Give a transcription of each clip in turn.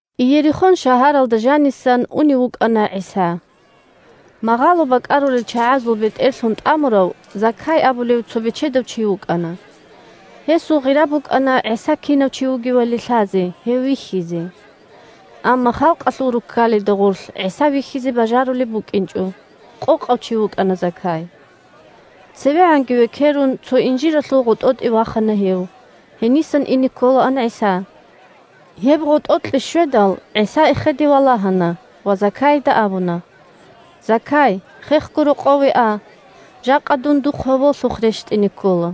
Иерихон шагьаралда жанисан унев вукӀана ГӀиса. Магъало бакӀарулел чагӀазул бетӀерлъун тӀамурав Закай абулев цо бечедав чи вукӀана. Гьесул гъира букӀана ГӀиса кинав чи вугевали лъазе, гьев вихьизе. Амма халкъалъул руккалида гъорлъ ГӀиса вихьизе бажарулеб букӀинчӀо, – къокъав чи вукӀана Закай. ЦевегӀанги векерун цо инжиралъул гъотӀотӀе вахана гьев: гьенисан ине кколаан ГӀиса. Гьеб гъотӀокье щведал, ГӀиса эхеде валагьана ва Закайида абуна: – Закай, хехго рокъове а: жакъа дун духъ гьоболлъухъ рещтӀине ккола.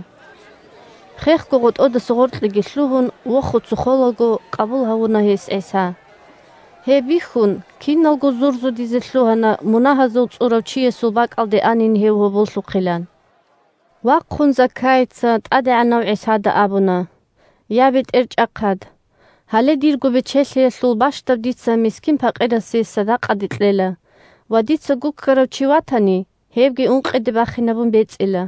Хехго гъотӀодаса гъоркьеги лъугьун, вохуца холаго къабул гьавуна гьес ГӀиса. Гьеб бихьун киналго зурзудизе лъугьана мунагьазул цӀурав чиясул бакӀалде анин гьев гьоболлъухъилан. Вахъун Закайица ТӀадегӀанав ГӀисада абуна: – Я, БетӀерчӀахъад! Гьале дирго бечелъиялъул бащдаб дица мискин-пакъирасе садакъаде кьела ва, дица гуккарав чи ватани, гьебги ункъиде бахинабун бецӀила.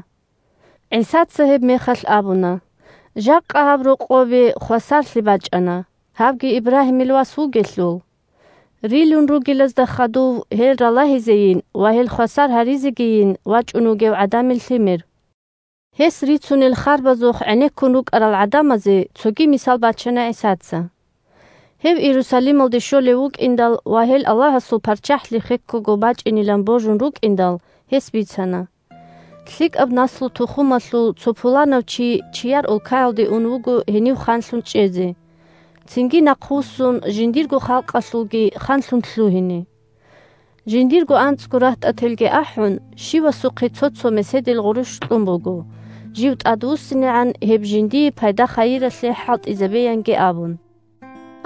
ГӀисаца гьебмехалъ абуна: – Жакъа гьаб рокъобе хвасарлъи бачӀана, гьавги Ибрагьимил вас вугелъул. Рилун ругелазда хадув, гьел ралагьизейин ва гьел хвасар гьаризегийин, вачӀун вугев ГӀадамил Лъимер. Гьес рицунел харбазухъ гӀенеккун рукӀарал гӀадамазе цоги мисал бачана ГӀисаца. Гьев Иерусалималде щолев вукӀиндал ва гьел Аллагьасул ПарччахӀлъи хеккого бачӀинилан божун рукӀиндал, гьес бицана: – ЛъикӀаб наслу-тухумалъул цо пуланав чи чияр улкаялде ун вуго гьенив ханлъун чӀезе, цинги нахъвуссун жиндирго халкъалъулги ханлъун лъугьине. Жиндирго анцӀго рагьтӀателги ахӀун, щивасухъе цо-цо меседил гъурущ кьун буго, жив тӀадвуссинегӀан гьеб жиндие пайда-хайиралъе хӀалтӀизабеянги абун.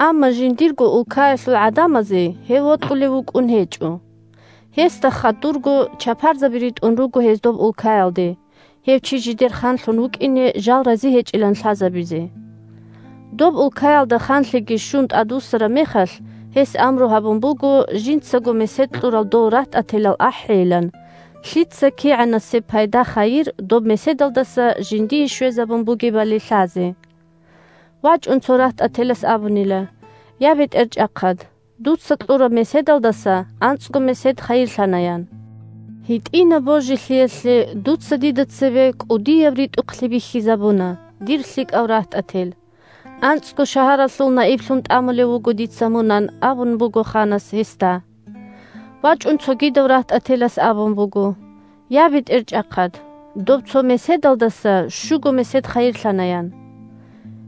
Амма жиндирго улкаялъул гӀадамазе гьев вокьулев вукӀун гьечӀо. Гьесда хадурго чапарзаби ритӀун руго гьез доб улкаялде, гьев чи жидер ханлъун вукӀине жал рази гьечӀилан лъазабизе. Доб улкаялда ханлъиги щун тӀадвуссараб мехалъ, гьес амру гьабун буго жинцаго месед кьурал дол рагьтӀателал ахӀейилан, лъица кигӀанасеб пайда-хайир доб меседалдаса жиндие щвезабун бугебали лъазе. ВачӀун цо рагьтӀателас абунила: «Я, бетӀерчӀахъад, дуца кьураб меседалдаса анцӀго месед хайирлъана», – ян. «ГьитӀинаб божилъиялъе дуца дида цебе кӀудияб ритӀухълъи бихьизабуна, дир лъикӀав рагьтӀател. АнцӀго шагьаралъул наиблъун тӀамулев вуго дица мун», – ан абун буго ханас гьесда. ВачӀун цогидав рагьтӀателас абун буго: «Я, бетӀерчӀахъад, доб цо меседалдаса щуго месед хайирлъана», – ян.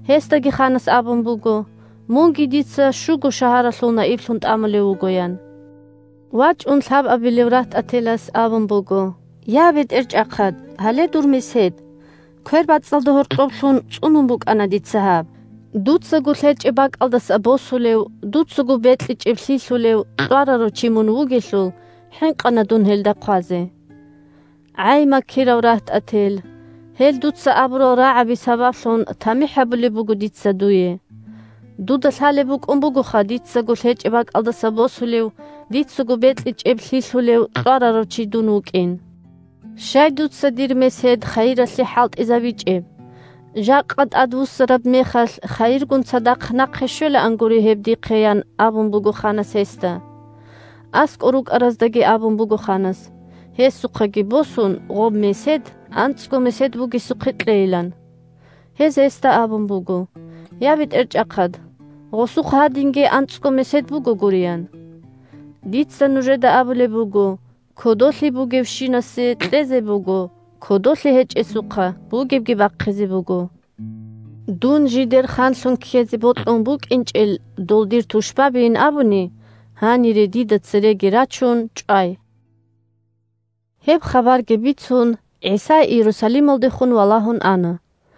Гьесдаги ханас абун буго: «Мунги дица щуго шагьаралъул наиблъун тӀамулев вуго», – ян. ВачӀун лъабабилев рагьтӀателас абун буго: «Я, бетӀерчӀахъад, гьале дур месед. КвербацӀцӀалда гьоркьоб лъун цӀунун букӀана дица гьаб. Дуцаго лъечӀеб бакӀалдаса босулев, дуцаго бекьичӀеб лъилъулев кьварарав чи мун вугелъул, хӀинкъана дун гьелда хъвазе». «ГӀай, макирав рагьтӀател! Гьел дуца абурал рагӀаби сабаблъун тамихӀ гьабулеб буго дица дуе. Дуда лъалеб букӀун бугоха дицаго лъечӀеб бакӀалдаса босулев, дицаго бекьичӀеб лъилъулев кьварарав чи дун вукӀин. Щай дуца дир месед хайиралъе хӀалтӀизабичӀеб, жакъа тӀадвуссараб мехалъ хайиргун цадахъ нахъе щвелаангури гьеб дихъе?» – ян абун буго ханас гьесда. АскӀор рукӀараздаги абун буго ханас, гьесухъаги босун, гъоб месед анцӀго месед бугесухъе кьейилан. Гьез гьесда абун буго: «Я, бетӀерчӀахъад, гъосухъ гьадинги анцӀго месед бугогури», – ян. «Дица нужеда абулеб буго: кодолъи бугевщинасе кьезе буго, кодолъи гьечӀесухъа бугебги бахъизе буго. Дун жидер ханлъун ккезе бокьун букӀинчӀел дол дир тушбабийин абуни, гьанире дида цереги рачун, чӀвай!» Гьеб хабарги бицун, ГӀиса Иерусалималдехун валагьун ана.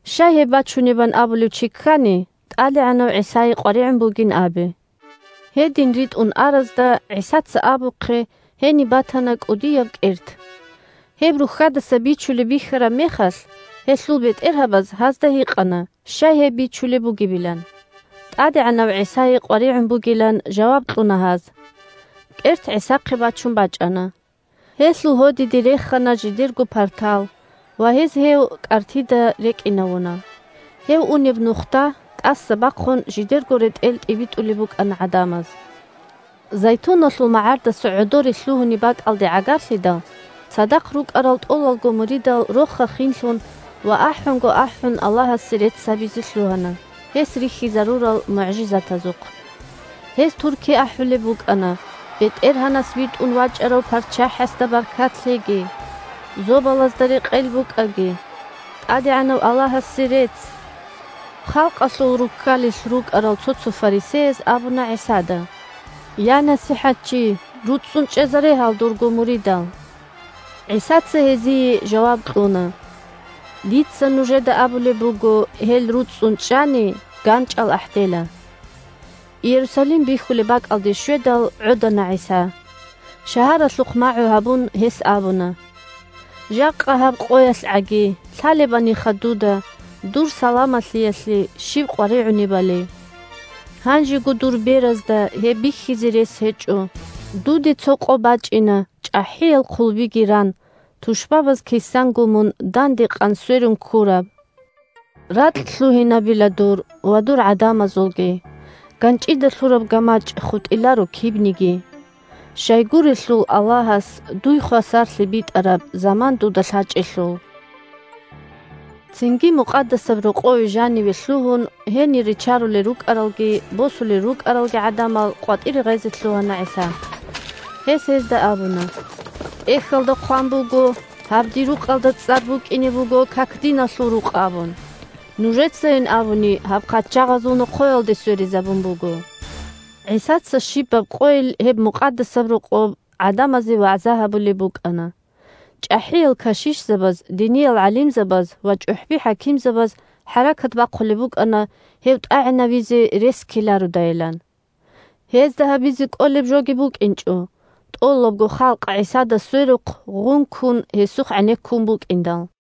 Щай гьеб бачунебан абулев чи ккани, ТӀадегӀанав ГӀисае къваригӀун бугин абе. Гьедин ритӀун аразда, ГӀисаца абухъе, гьениб батана кӀудияб кӀерт. Гьеб рухьадаса бичулеб бихьараб мехалъ, гьелъул бетӀергьабаз гьазда гьикъана щай гьеб бичулеб бугебилан. ТӀадегӀанав ГӀисае къваригӀун бугилан жаваб кьуна гьаз. КӀерт ГӀисахъе бачун бачӀана. Гьелъул гьодиде рехана жидерго партал ва гьез гьев кӀартида рекӀинавуна. Гьев унеб нухда, тӀаса бахъун, жидерго ретӀел тӀибитӀулеб букӀана гӀадамаз. Зайтуналъул магӀардаса гӀодоре лъугьунеб бакӀалде гӀагарлъидал, цадахъ рукӀарал тӀолалго муридал роха-хинлъун ва ахӀунго ахӀун Аллагьасе рецц гьабизе лъугьана, гьес рихьизарурал мугӀжизатазухъ. Гьез турки ахӀулеб букӀана: – БетӀергьанас витӀун вачӀарав ПарччахӀасда баркат лъеги! Зобалазда рекъел букӀаги! ТӀадегӀанав Аллагьасе рецц! Халкъалъул руккалилъ рукӀарал цо-цо фарисеяз абуна ГӀисада: – Я, НасихӀатчи! РуцӀцӀун чӀезаре гьал дурго муридал! ГӀисаца гьезие жаваб кьуна: – Дица нужеда абулеб буго: гьел руцӀцӀун чӀани, ганчӀал ахӀдела. Иерусалим бихьулеб бакӀалде щведал, гӀодана ГӀиса. Шагьаралъухъ магӀу гьабун, гьес абуна: – Жакъа, гьаб къоялъгӀаги, лъалебаниха дуда дур саламалъиялъе щиб къваригӀунебали! Гьанжего дур беразда гьеб бихьизе рес гьечӀо. Дуде цо къо бачӀина, чӀахӀиял хъулбиги ран, тушбабаз кисанго мун данде къан сверун ккураб. Ракь лъугьинабила дур Ва дур гӀадамазулги. ГанчӀида лъураб гамачӀ хутӀиларо кибниги. Щайгурелъул Аллагьас Дуй хвасарлъи битӀараб Заман дуда лъачӀелъул. Цинги Мукъадасаб Рокъове жаниве лъугьун, гьенир ричарулел рукӀаралги босулел рукӀаралги гӀадамал къватӀире гъезе лъугьана ГӀиса. Гьес гьезда абуна: – ТӀехьалда хъван буго: «Гьаб Дир рукъалда цӀар букӀине буго как-диналъул рукъ» абун. Нужецайин абуни гьаб хъачагъазул нохъоялде сверизабун буго. ГӀисаца щибаб къойил гьеб Мукъадасаб Рокъоб гӀадамазе вагӀза гьабулеб букӀана. ЧӀахӀиял кашишзабаз, диниял гӀалимзабаз ва чӀухӀби-хӀакимзабаз хӀаракат бахъулеб букӀана гьев тӀагӀинавизе рес ккелародайилан. Гьезда гьабизе кӀолеб жоги букӀинчӀо, тӀолабго халкъ ГӀисада сверухъ гъункун, гьесухъ гӀенеккун букӀиндал.